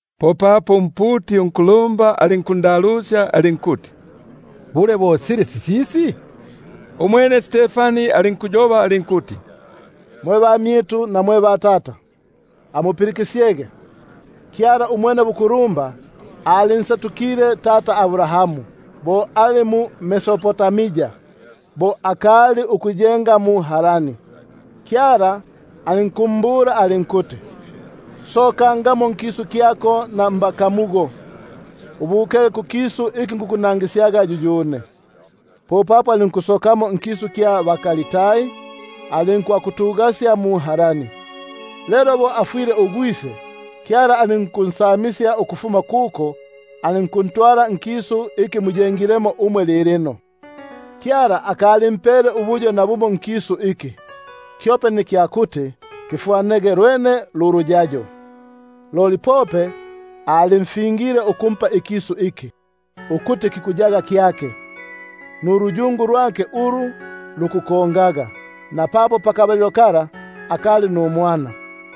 Popapo umputi unkulumba alinkundalusya alinkuti: Bule, bo sili sisisi? Umwene alinkuyoba alinkuti: Mwe bamyitu, na mwe batata, amupilikisyege, Kyala Umwenebukulumba alinsetukile tata Abrahamu, apa ali mu-Mesopo- tamia, bo akali ikuyenga mu-Harani, alinkumbula alinkuti: Sokaga nkisu kyako na mbakamu bako, ubukege kukisu iki nikukunangisyaga yuyune. Popapo alinkusokamo nkisu kya baKaldai; alinkwakutugasya mu-Harani. Lelo bo afwile ugwise, Kyala alinkunsamisya ukufuma kuko, alinkuntwala nkisu iki muyengilemo umwe lilino. Alinkusita nukumpa nakimo ikilingo mumo, kyope nikya kuti kifwane uluyayo, loli alinkufinga ulufingo ukumpa ukuti kiyege kyake, nuluyungu lwake ulu lukunkongaga, napapo akali numwana.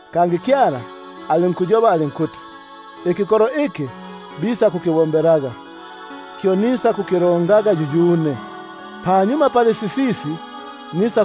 Kangi Kyala ayobile atile: Ikikolo iki bisakumbombelaga, kyo nisakukilongaga yuyune; lelo panyuma pali sisisi, bisa-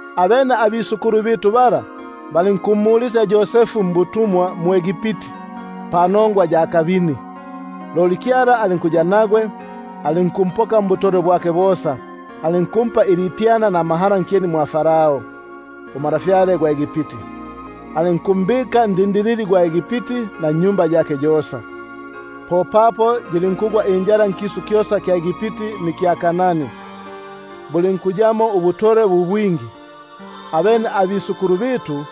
Abene abisukulu bitu bala balinkumulisya Yosefu mwʼEgipti panongwa ya kabini; loli Kyala alinkuya nagwe, alinkumpoka mbutolwe bwake bosa, alinkumpa ilipyana namahala nkyeni mwa Farao untwa gwa Egipti, alinkumpela ndindilili gwa Egipti, na nnyumba yake yosa. Popapo yilinkugwa injala nkisu kyosa kya Egipti nikya Kanani, bulinkuyamo ubutolwe bu bwingi; abene abatata bitu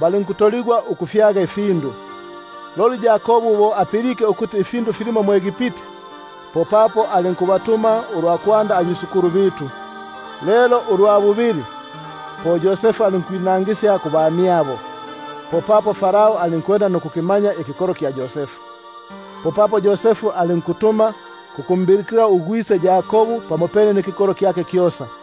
balinkusita nukufyaga ifindu. Loli Yakobu bo apilike ukuti ifindu filimo mwʼEgipti, popapo ulwa kwanda alinkubatuma batata; lelo ulwa bubili, po Yosefu alinkwinangisya kubamyabo, popapo Farao alinkwenda nukulumanya ikikolo kya Yosefu. Popapo Yosefu alinkutuma kukumbilikila ugwise Yakobu pamopene nikikolo kyake kyosa,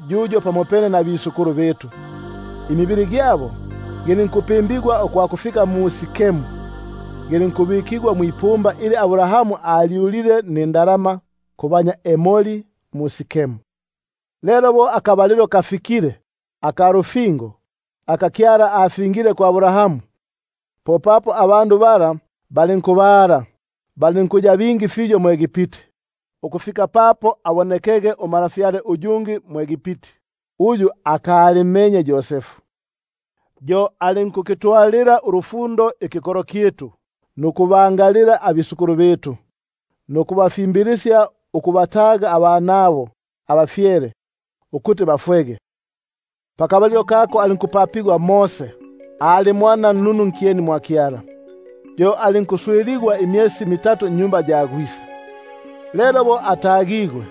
yuyo pamopene nabatata bitu; balinkupimbigwa ukwakufika mu-Sikemu, balinkubuligwa mwipumba ili Abrahamu alyulile nindalama kubanya Emori mu-Sikemu. Lelo bo kasegelile akabalilo ka lufingo, aka Kyala afingile na Abrahamu, popapo ikikolo kilinkukula nukubala mwʼEgipti, ukufika papo abonekege untwa uyungi mwʼEgipti, uyu aka- limmenye Yosefu. Yo alinkukitwalila ubukomu ikikolo kyitu, nukubangalila batata, nukubapelela ukubataga abanabo abafyele, ukuti bangayangako kubumi. Pakabalilo kako po alinkupapigwa Mose, alinkuboneka ubununu kwa Kyala; yo alinkuswiligwa imyesi mitatu nnyumba ya gwise. Lelo bo atagigwe,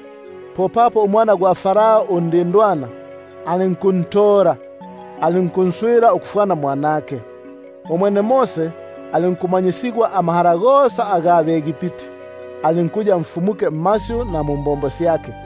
popapo umwana undindwana gwa Farao alinkuntola, alinkunswila ukufwana mwanake. Umwene Mose alinkumanyisigwa amahala gosa aga bʼEgipti; alinkuya namaka mmasyu na mumbombo syake.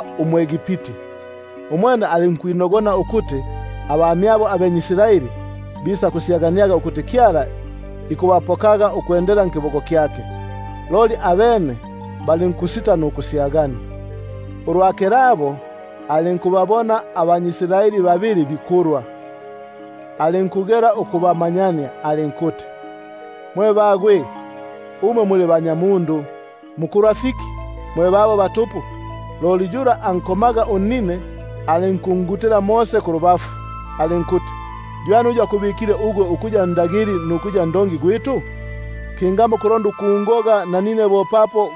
umwʼEgipti. Umwene alinkwinogona ukuti abamyabo bikusyaganiaga ukuti Kyala ikubapaga ubupoki nkiboko kyake, loli abene balinkusita nukusyagania. Ulwa kilabo alinkubaga bo bikumana, alinkulonda ukubamanyania alinkuti: Mwe tunya muli banyamundu, mukumana fiki mwe babo batupu? Loli uyu ambombelaga unnine imbibi, alinkungutila kulubafu alinkuti: Ywani uyu akubikile ugwe ukuya ndagili nukuya ndongi gwitu? Kingamo kulonda ukungoga nanine bo papo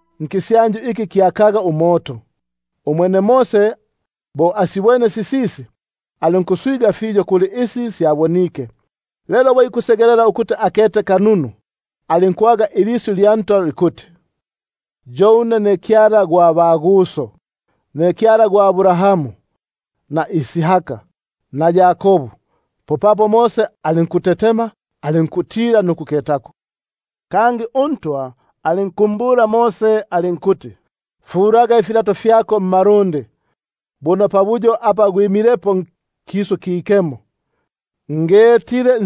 ndulapi lwa moto nkisyanju. Umwene Mose bo asibwene sisisi, alinkuswiganika kuli isi syabonike; lelo bo ikusegelela ukuti akete kanunu, alinkwaga ilisyu lya Ntwa likuti: Yo une ne Kyala gwa baguso, ne Kyala gwa Abrahamu, Isaka na Yakobu. Popapo Mose alinkutetema alinkutila nukuketako. Loli uNtwa alinkumbula alinkuti: Fulaga ifilato fyako mmalundi, buno pabuyo apa gwimilepo kisu kikemo. Ukuketa ko ngetile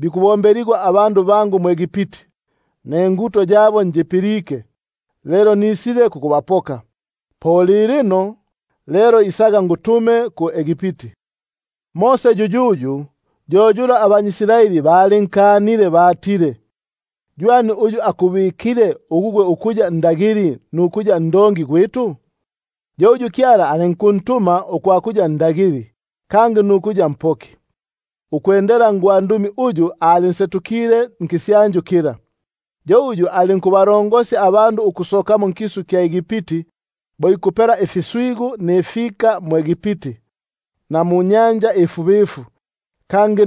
ukukubilwa kwa bandu bangu mwʼEgipti, ninguto yabo njipilike, lelo ilikilile kukubapoka; lilino lelo isaga ngutume mwʼEgipti. Mose yuyuyu uyu balinkanile balile: Ywani uyu akubikile ugwe ukuya ndagili nukuya ndongi? yo uyu Kyala alinkuntuma ukuya ndagili, kangi nukuya mpoki, nkiboko kya gwandumi uyu alinsetukile nkisyanju kila. Yo alinkubasosya bo ikupela ifiswigu nifika nkisu kya Egipti, na muNyanja Ifubifu, kangi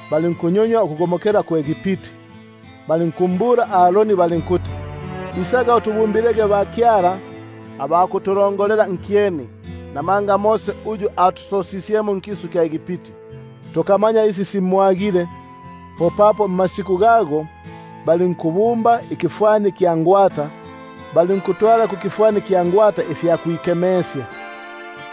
syabo balinkusilabisya mwʼEgipti, balinkuyoba na Aroni balinkuti: Isaga utubumbilege bakyala ba kutulongolela nkyeni; buno Mose uyu atusosisye nkisu kya Egipti, tuka- manya isi simwagile. Popapo mmasiku gago balinkubumba ingwata, balinkutwala kukifwani ifya kwikemesya, balinku-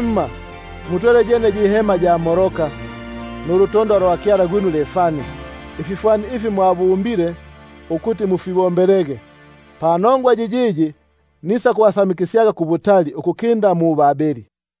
Himma, mwatwele yene yi hema ya Moloka, Nulutondwa lwa kyala gwinu Refani, Ififwani ifi mwabumbile ukuti mufibombelege; Nisakubasamikisyaga kubutali ukukinda mu-Babeli.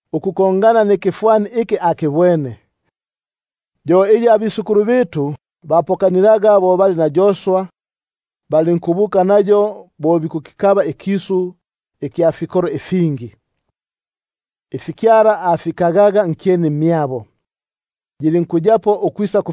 ukufwana nikifwani iki akibwene, iyi batata bapokanilaga; lelo bo bali na Yosua, balinkuyitwala nkisu iki bakikabaga ukufuma kubapanja, aba Kyala abakagaga nkyeni mwa batata, ukwisaku-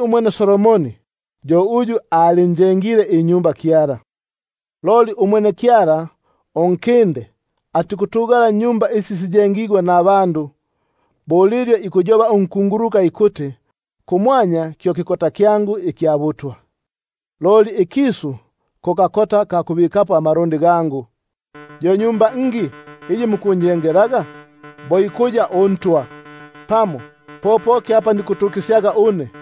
Umwene Solomoni yo alinkunjengela inyumba. Loli umwene Unkinde atikutugala munjengigwa namaboko; bo lilyo ikuyoba unkunguluka apa ikuti: Kumwanya kyo kikota kyangu ikya butwa, Loli ikisu ko kakota ka kubikapo amalundi gangu; Yo nyumba ngi iyi mukunjengelaga? bo ikuya uNtwa, Pamo po poki pabutukisyo une?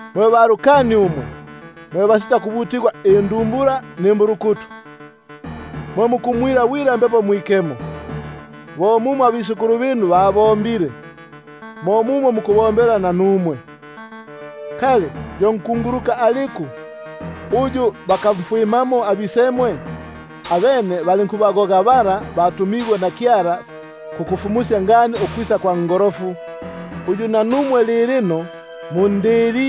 Mwe bakafu amakosi umwe, mwe basitakubutigwako indumbula nimbulukutu, mwe mukumwila bwila Mbepo Mwikemo, bo mumo abisemwe babombile, mo mumo muku- bombela nanumwe. Yo nkunguluka aliku uyu bakamfwimamo abisemwe? Abene babagogaga aba bafumukisyaga ngani ukwisa kwa Ngolofu, uyu nanumwe lilino mumbikile mmaboko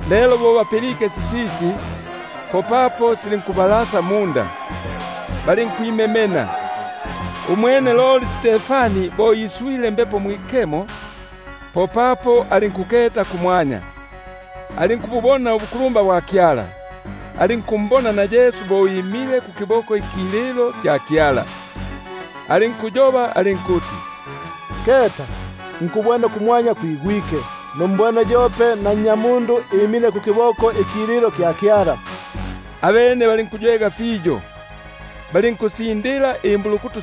Lelo bo bapilike sisisi, popapo silinkubalasa munda, bali- nkwimemena. Umwene loli bo iswile Mbepo Mwikemo, popapo alinkululalila kumwanya, alinkububona ubukulumba bwa Kyala, alinkumbona na Yesu bo imile kukiboko ikililo kya Kyala, alinkuti: Keta, nkubwene kumwanya kwigwike, numbwene yope na Nnyamundu imile kukiboko ikililo kya Kyala. Abene balinkuywega fiyo, balinkusindila imbulukutu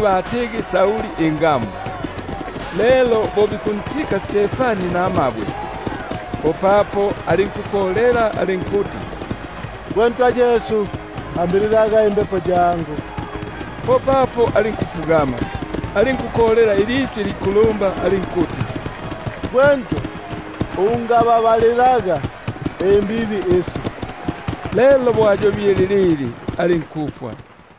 batigi Sauli ingamu. Lelo bo bikuntika Stefani namabwe, popapo alinkukolela alinkuti: Gwe Ntwa Yesu, ambililaga imbepo yangu. Popapo alinkufugama, alinkukolela ilisyu ilikulumba alinkuti: Gwe Ntwa, ungababalilaga imbibi isi; lelo bo ayobile lilili, alinkufwa.